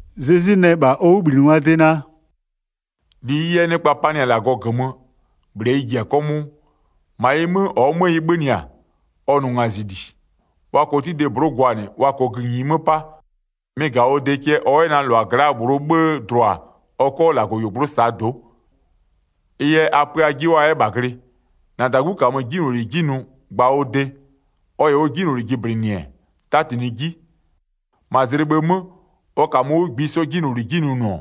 Zezwi nɛ -bha ɔ 'wʋbhlinɩngwaa de naa: “-Li -ɩɩ yɛ nɩkpa panɩ-a -Lagɔ -gömö, -bhlɩɛ ɩ ji-a 'kɔmʋʋ. -Ma ɩ 'mö, -ɔɔ 'mö ɩ 'bhönɩ-a, ɔ nʋ ngazɩli. Wa -kɔɔ 'tide -blʋ'ʋ gwanɩ, wa -kɔɔ gïnyi 'mö 'pa, mɩ-ɩ -ga-a ɔ de cɛ ɔ 'yɛ na -lʋa gla'aa -bhlʋɔ 'bhë dlʋa ɔ 'kɔ -Lagɔyuogblʋ'ʋ -saa do'o. Ɩ yɛ a pö ajɩ 'wʋ a 'yɛ -bha glɩ. -Na -dagu -kamö 'jinyloli 'ji nʋ gba ɔ de. Ɔ -yɛ ɔ 'jinyloli jɩblɩnɩ-ɛ, 'tatinɩɩ 'ji. 4-Ma zlɩ bhë 'mö, ɔ -kamö 'wʋ -ngbisɔ 'jinyloli 'ji nʋnʋ-ɔ,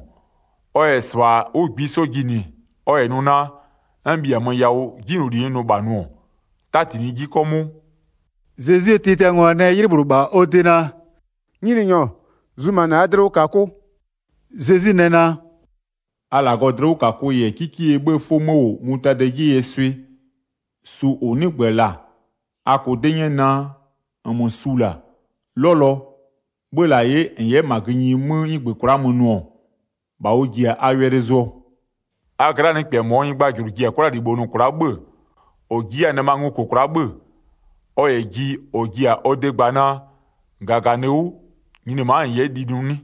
ɔ -yɛ -sɩbha 'wʋ -ngbisɔ jinɩ ɔ -yɛ nʋ naa: N -bhiamö yawʋ 'jinyloli n nʋ -bha nʋ-ɔ, 'tatinɩɩ 'ji 'kɔmʋʋ.” Zezwie tiatiangwa nɛ 'ylɩ -bhlʋ -bha ɔ de naa: “Nyininyɔ, zumanɩ -aa dlɩwʋkakʋ.” Zezwi nɛ naa: “A -Lagɔɔ dlɩwʋkakʋ -yɛ 'kikeyie 'bhëë 'fʋ 'mö -wʋ mutadɩɛ 'jeyie swɩ, su -ʋ 'nɩgbö-ö -la, a -kʋʋ 'dɩ 'nyɛ naa, -nmö su -la, 'lɔlɔ, 'bhö-ö -la 'ye -n 'yɛ -ma gïnyi 'mö 'nɩgbö kwla'a mö nʋ-ɔ, -bha ʋ ji-a a wɛlɩ zʋɔ. A gla'aa nɩkpɛ -mɔɔ nyɩgbajʋlʋ ji-a 'kwlalibho nʋ kwla'a 'bhö-ö -ɔ ji 'yɛ-a nɩma ngo -kʋ kwla'a 'bhö-ö, ɔ -yɛ ji -ɔ ji-a ɔ de gba naa: -Gaganɩ 'wʋ, nyini ma'a -n 'yɛ li nʋ 'nɩ?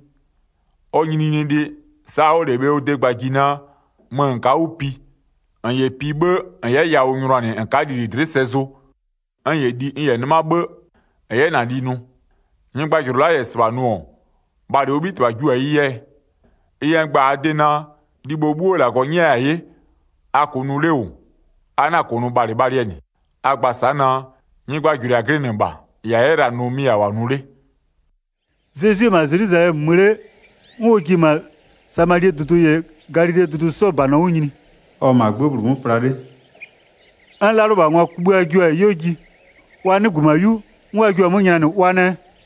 Ɔ nyininyinilɩ, sa'a ɔ'ɔ -lɛ bhe ɔ de gbaa ji naa: Mö -n ka'a 'wʋ pi, -n -yɛ pi 'bhë, -n 'yɛ yawʋ nyʋnanɩ -n ka'a lili dlɩ'ɩ sɛ zʋ, n -yɛ li n -yɛ 'nɩma 'bhë, -n 'yɛ -na li nʋ? Nyɩgbajʋlʋ la'a -yɛ -sɩbha nʋ-ɔ, bhalɩ ɔ 'bhitɩbha jio-a ɩ yɛɛ? Ɩ yɛ n gba-a a de naa: Libho 'bhuo -Lagɔ 'nyɛya-a 'ye, a -kʋʋ nʋ 'le -wʋ, a na-a -kʋnʋ a bhalɩbhalɩɛ -nɩ, a gba sa'a naa: Nyɩgbajʋlʋɩ -a glɩnɩ -bha -ɩ -a 'yɛ la-a nʋ mɩ -a -wʋ-a nʋ 'le.” Zezwi-e -ma Zelwizalɛmö mö 'le, 'n ɔ ji-e -ma Samalie dʋdʋ -yɛ Galilee dʋdʋ 'sɔɔ -banɔ 'wʋ nyini. Ɔ-ɔ -maa 'gbë -bhlʋ 'mö pla 'le, 'n 'lalʋlɩbhangwa kugbïa jio-a 'yuo ji, wa 'nɩgbö -ma 'yu, 'n wa jio-a 'mö nylanɩ wa nɛ: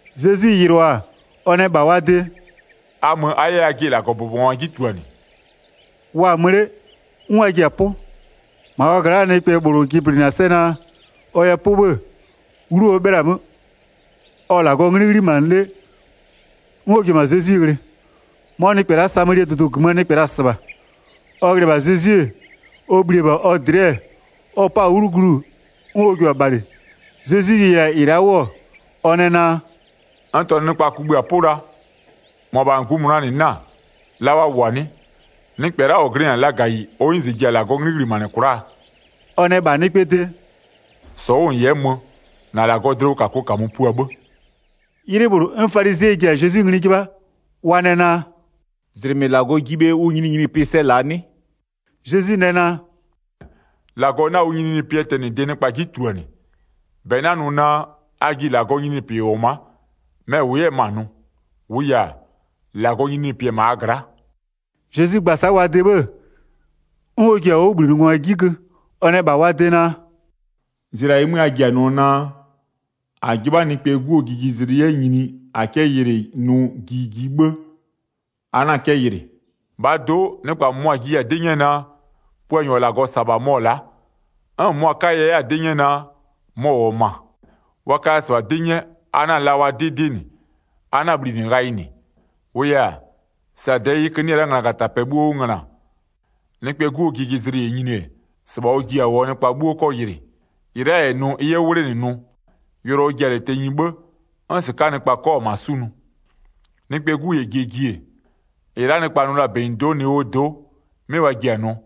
Zezwi yɩlʋa-a 'wʋ ɔ nɛ -bha wa de: “A mö, a 'yɛ ajɩ -Lagɔbʋbɔngwa 'ji tuluanɩ.” Wa-a -ma mö 'le 'n wa ji-a 'pʋ. 15-Ma wa gla'aa nɩkpɛ -bhlʋ jɩblɩnɩ-a sɛ naa ɔ yɛ 'pʋ 'bhë-ë, 'wlu ɔ 'bhɩla-a 'mö, ɔ-ɔ -Lagɔɔ 'nglɩ 'ghlimanɩ 'le, 'n ɔ ji-e -ma Zezwi ghlɩ. 'Mɔ nɩkpɛ la'a Samalie dʋdʋ -gömöö nɩkpɛ la-a -sɩbha. Ɔ ghlɩ-ɛ -bha Zezwi, ɔ bhli-e -bha ɔ dlɩ'ɩ, ɔ 'pa-a 'wlu glu 'n ɔ jio-a bhalɩ. Zezwi yɩlɩ-a -ɩ la'a 'wʋ-ɔ, ɔ nɛ naa: “N -tɔnʋ nɩkpa kugbïa-a 'pʋ la, -mʋabha -ngbïmʋnaa -nɩ 'na-a, la wa -wʋ-a 'nɩ? Nɩkpɛ la'a -ɔ glɩnɩ-a lagayi ɔ 'nyize ji-a -Lagɔɔ 'nglɩ -ghlimanɩ kwla'aa?” Ɔ nɛ -bha nɩkpɛɛ de: “-Sɔ 'wʋ -n 'yɛ mö -na -Lagɔɔ dlɩwʋkakʋ -kamö pua 'bhë.” 'Ylɩ -bhlʋ, 'n falizɩɛ ji-a Zezwi ngli 'jɩbha, wa nɛ naa: “-Zlɩmɩ -Lagɔ ji bhe ʋ nyininyinipɩ sɛ -laa 'nɩ?” Zezwi nɛ naa: “-Lagɔ 'na ʋ nyininyinipɩɛ tɛnɩde nɩkpa 'ji tuluanɩ. 21-Bɛ 'na nʋ naa, a ji -Lagɔɔ nyininyinipɩ -wʋ-ɔ ma'a, mɛ-ɛ -wʋ 'yɛ-ɛ -ma nʋ, -wʋʋ yɛ-a, -Lagɔɔ nyininyinipɩ-ɛ -ma a gla'a.” Zezwi gba-a sa'a wa de 'bhë-ë, 'n ɔ ji-a ɔ 'wʋbhlinɩngwa 'ji gö, ɔ nɛ -bha wa de naa: “Zlɩa -ɩɩ 'mö a ji-a nʋɔ naa: -A 'jɩbha Nɩkpɛɛ 'Guo jijizlɩ 'yɛ nyini -a 'kɛ yɩlɩ nʋ ɩ ji ji 'bhë, a 'na 'kɛ yɩlɩ. 23-Bhaa do'o nɩkpa -mʋmʋa jiya-a 'dɩ 'nyɛɛ naa: Puanyɔ -ɔ -Lagɔ -sa-a -bha mɔ-ɔ la'a, 'n -mʋmʋa 'kaya 'yɛ-a 'dɩ 'nyɛ naa, mɔ-ɔ -wʋ-ɔ -ma. Wa kaya -sɩbha 'dɩ 'nyɛ, a 'na-a la wa 'dɩ 'dɩ -nɩ, a 'na-a bhlinɩ ghayɩ -nɩ. 24-Wʋʋ yɛ-a, sa -dɛɛ 'yɩkö 'nɩ-ɛ la'a nglagatapɛ 'bhuo 'wʋ ngöna, Nɩkpɛɛ 'Guo jijizlɩ -yɛ nyini-e, -sɩbha ɔ ji-a -wʋɔ nɩkpa 'bhuo 'kɔ yɩlɩ. 25-Ɩ la'a -yɛ nʋ ɩ 'yɛ 'wʋ 'wlenɩ nʋ, yʋlɔ ɔ ji-a -lɛ tenyi 'bhë, 'n -sɩka'aa nɩkpa 'kɔ-a -ma 'sunʋ. Nɩkpɛɛ 'Gu -yɛ jie ji-e, -ɩ la'a nɩkpa nʋ la-a -benyido'o Nowee do'o, 'mɩ wa ji-a nʋɔ.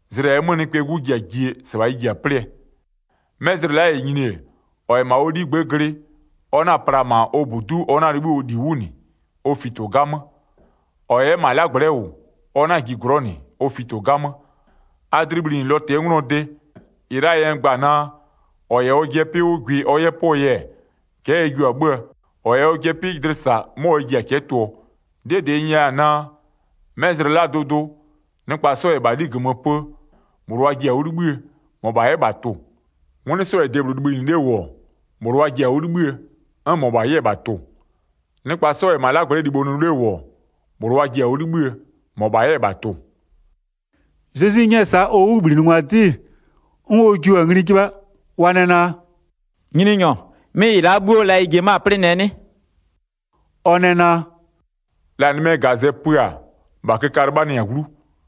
Zlɩ -ɛɛ 'mö Nɩkpɛɛ 'Gu ji-a ji-e -sɩbha ɩ ji-a 'plɩɛ. 'Mɛ zlɩ la'a -yɛ nyini-e, -ɔ -yɛ -ma ɔ 'ligbë'ë glɩ, ɔ 'na-a pla -ma ɔ -budu'u ɔ 'na-a 'libhï ɔ -li 'wʋ -nɩ, ɔ fito 'gamö. -Ɔ -yɛ 'yɛ -ma ɔ 'lagblɛ'ɛ -wʋ, ɔ 'na-a ji glɔ'ɔ -nɩ, ɔ fito 'gamö. A dlɩ bhlinɩ Lɔtɩɛ 'nglɔɔ de. 33-Ɩ la'aa yɛ n gba-a naa: -Ɔ -yɛ ɔjɩɛ 'pɩ 'wʋ gwɩ ɔ 'yɛ pʋɔ yɛ, cɛ'ɛ ɛ jio-a 'bhö-ö, -ɔ -yɛ ɔjɩ dlɩ -sa, 'mɔ ɛ ji-a cɛ'ɛ tʋɔ. 'Dɩɛ -dɩ n nyɛya-a naa: 'Mɛ zlɩ la'aa dʋdʋ, nɩkpa 'sɔ -yɛ -bha 'li -gömö pö-ö, -bhlʋ wa ji-a 'wʋ 'libhïë, -mɔbha 'yɛ -bha tʋ-ʋ. 'Ngwlɩ 'sɔ -yɛ debhlʋ libhïnɩ 'le -wʋ-ɔ, -bhlʋ wa ji-a 'wʋ 'libhïë, 'n -mɔbha 'yɛ-ɛ -bha tʋ-ʋ. [ Nɩkpa 'sɔ -yɛ -ma 'lagblɛ'ɛ libho nʋ 'le -wʋ-ɔ, -bhlʋ wa ji-a 'wʋ 'libhïë, -mɔbha 'yɛ -bha tʋ-ʋ.”] Zezwi 'nyɛ-ɛ sa'a ɔ 'wʋbhlinɩngwa 'dɩ, 'n wa jio-a ngli 'jɩbha, wa nɛ naa: “Nyininyɔ 'mɩ -ɩ -la 'bhuo, la ɩ ji-e 'mö-a 'plɩnɩɛ 'nɩ?” Ɔ nɛ naa: “La nɩmɛɛ -gazɛ pö-a -bha köka 'lɩbhanɩ-a 'wlu.”